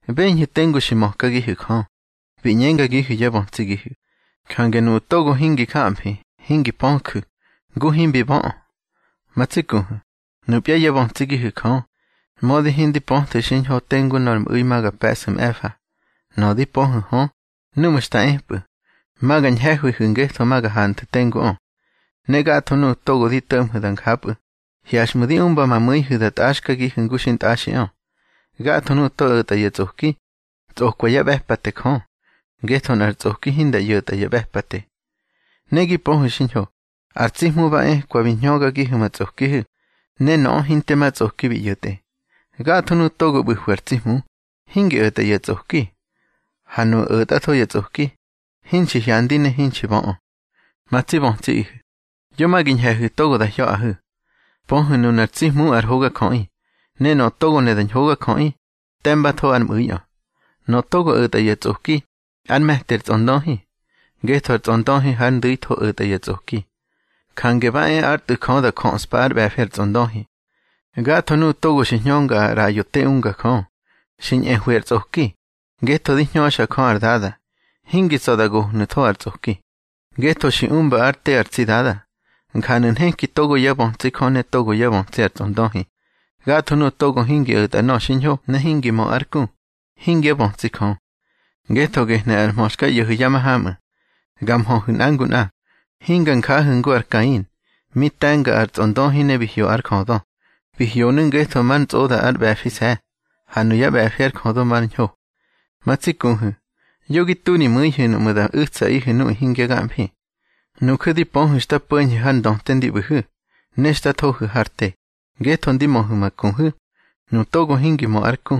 Beñhu̱ tengu xi mökagihu̱ Jö, bi ꞌñengagihu̱ yá bötsigihu̱. Jange nuꞌu̱ togo hingi jamfi, hingi pöju̱, ngu himbi böꞌö. Ma tsi kuhu̱, nupya yá bötsigihu̱ Jö, mödi hindi pöthu̱ xiñho tengu nor mꞌu̱i ma ga pe̱ꞌsu̱ mꞌe̱fa. Nöꞌö di pöhu̱ hö, núꞌmu̱ xta epꞌu̱, ma ga ñhe̱hwihu̱ ngetho ma ga hanthu̱ tenguꞌö. Ne gatho nuꞌu̱ togo di to̱ꞌmhu̱ da njapꞌu̱, hyaxꞌmu̱ di umba ma mu̱ihu̱ da tꞌaxkagihu̱ ngu xintꞌaxiꞌö. Gatho nuꞌu̱ togo o̱tꞌa ya tsꞌoki, tsꞌokwa yá ꞌbe̱pate Jö, ngetho nꞌar tsꞌoki hinda ꞌyo̱ta ya ꞌbe̱pate. Ne gi pöhu̱ xiñho, ar tsi Hmu ba ekwa bi hñögagihu̱ ma tsꞌokihu̱, ne nöꞌö hinte ma tsꞌoki bi ꞌyo̱tꞌe. Gatho nuꞌu̱ togo ꞌbu̱hwi ar tsi Hmu, hingi o̱tꞌa ya tsꞌoki. Ha nuꞌu̱ o̱tꞌatho ya tsꞌoki, hinxi hyandi ne hinxi böꞌö. Ma tsi bötsiꞌihu̱, yo ma gi ñhe̱hu̱ togo da hya̱ꞌahu̱. Pöhu̱ nunar tsi Hmu ar hogajöꞌi, ne nöꞌö togo ne da ñhogajöꞌi, te̱mbatho ár mꞌu̱iꞌö. Nöꞌö togo o̱tꞌa ya tsꞌoki, ár me̱ti ar tsꞌondöhi, ngetho ar tsꞌondöhi hár ndu̱itho o̱tꞌa ya tsꞌoki. Jange ba e ár Tꞌu̱ Jö da jöꞌspa ár ꞌbe̱fi ar tsꞌondöhi. Gatho nuꞌu̱ togo xi hñönga ar ꞌraꞌyo te unga Jö, xi ñꞌehwi ar tsꞌoki, ngetho di hñöxa Jö ar Dada. Hingi tsa̱ da gohnu̱tho har tsꞌoki, ngetho xi umba ár te ar tsi Dada. Njanu̱ nheki togo yá bötsi Jö ne togo yá bötsi ar tsꞌondöhi: Gatho nuꞌu̱ togo hingi o̱tꞌa nöꞌö xiñho ne hingi mö ár ku, hingyá bötsi Jö. Ngetho gehnu̱ ar mhö xka ꞌyo̱hu̱ ya mahamꞌu̱: Ga nmhöhu̱ nꞌa ngu nꞌa. Hinga njahu̱ ngu ar Kain, mi te̱nga ar tsꞌondöhi ne bi hyo ár jödö. Bi hyonu̱ ngetho mar ntsꞌoda ár ꞌbe̱fise̱, ha nuyá ꞌbe̱fi ár jödö mar ñho. Ma tsi kuhu̱, yo gi tu ri mu̱ihu̱ nuꞌmu̱ da u̱tsaꞌihu̱ nuꞌu̱ hingya gamfi. Nuju̱ di pöhu̱ xta po̱ñhu̱ har ndöte ndi ꞌbu̱hu̱, ne xta thohu̱ har te, ngetho di möhu̱ ma kuhu̱. Nu togo hingi mö ár ku,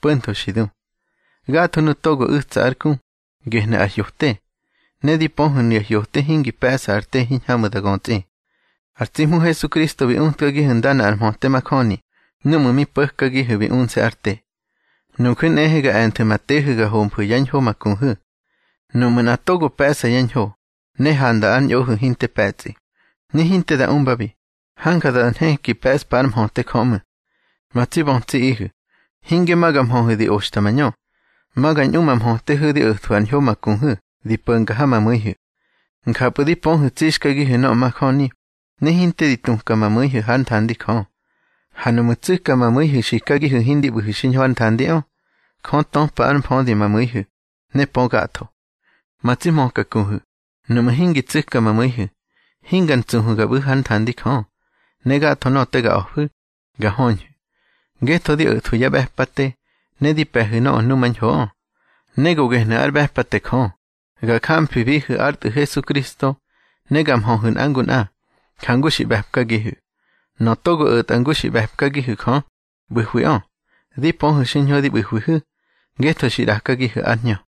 po̱ntho xi du. Gatho nuꞌu̱ togo u̱tsa ár ku, gehnu̱ ar hyote. Ne di pöhu̱ nuya hyote hingi pe̱ꞌsa ar te hiñhamꞌu̱ da götsꞌi. Ar tsi Hmu Hesukristo bi utkagihu̱ ndana ar mhöte majöni núꞌmu̱ mi po̱kagihu̱ bi unse̱ ár te. Nuju̱ nꞌehe ga e̱nthu̱ ma tehu̱ ga homfu̱ yá ñho ma kuhu̱. Nuꞌmu̱ nꞌa togo pe̱ꞌsa ya ñho, ne handa ár ñꞌohu̱ hinte pe̱tsꞌi, ne hinte da umbabi, hanja da nheki pe̱ꞌspa ár mhöte Jö ꞌmu̱. Ma tsi bötsiꞌihu̱, hinge ma ga mhöhu̱ di oxta mañö. Ma ga ñꞌu ma mhötehu̱ di o̱thwu̱ ar ñho ma kuhu̱ di po̱nga ha ma mu̱ihu̱. Njapꞌu̱ di pöhu̱ tsixkagihu̱ nöꞌö majöni, ne hinte di tuka ma mu̱ihu̱ hár nthandi Jö. Ha nuꞌmu̱ tsu̱ka ma mu̱ihu̱ xikagihu̱ hindi ꞌbu̱hu̱ xiñho hár nthandiꞌö, Jö töpa ár mfödi ma mu̱ihu̱, ne pö gatho. Ma tsi hmöka kuhu̱, nuꞌmu̱ hingi tsu̱ka ma mu̱ihu̱, hinga ntsuhu̱ ga ꞌbu̱hu̱ hár nthandi Jö. Ne gatho nöꞌö te ga a̱fu̱, ga höñhu̱, ngetho di o̱thwu̱ yá ꞌbe̱pate, ne di pe̱hu̱ nöꞌö numañhoꞌö. Ne go gehnu̱ ár ꞌbe̱pate Jö, ga jamfibihu̱ ár Tꞌu̱ Hesukristo, ne ga nmhöhu̱ nꞌa ngu nꞌa, jangu xi ꞌbe̱pkagihu̱. Nöꞌö togo o̱ta ngu xi ꞌbe̱pkagihu̱ Jö, ꞌbu̱hwiꞌö. Di pöhu̱ xiñho di ꞌbu̱hwihu̱, ngetho xi ꞌrakagihu̱ ár Hñö.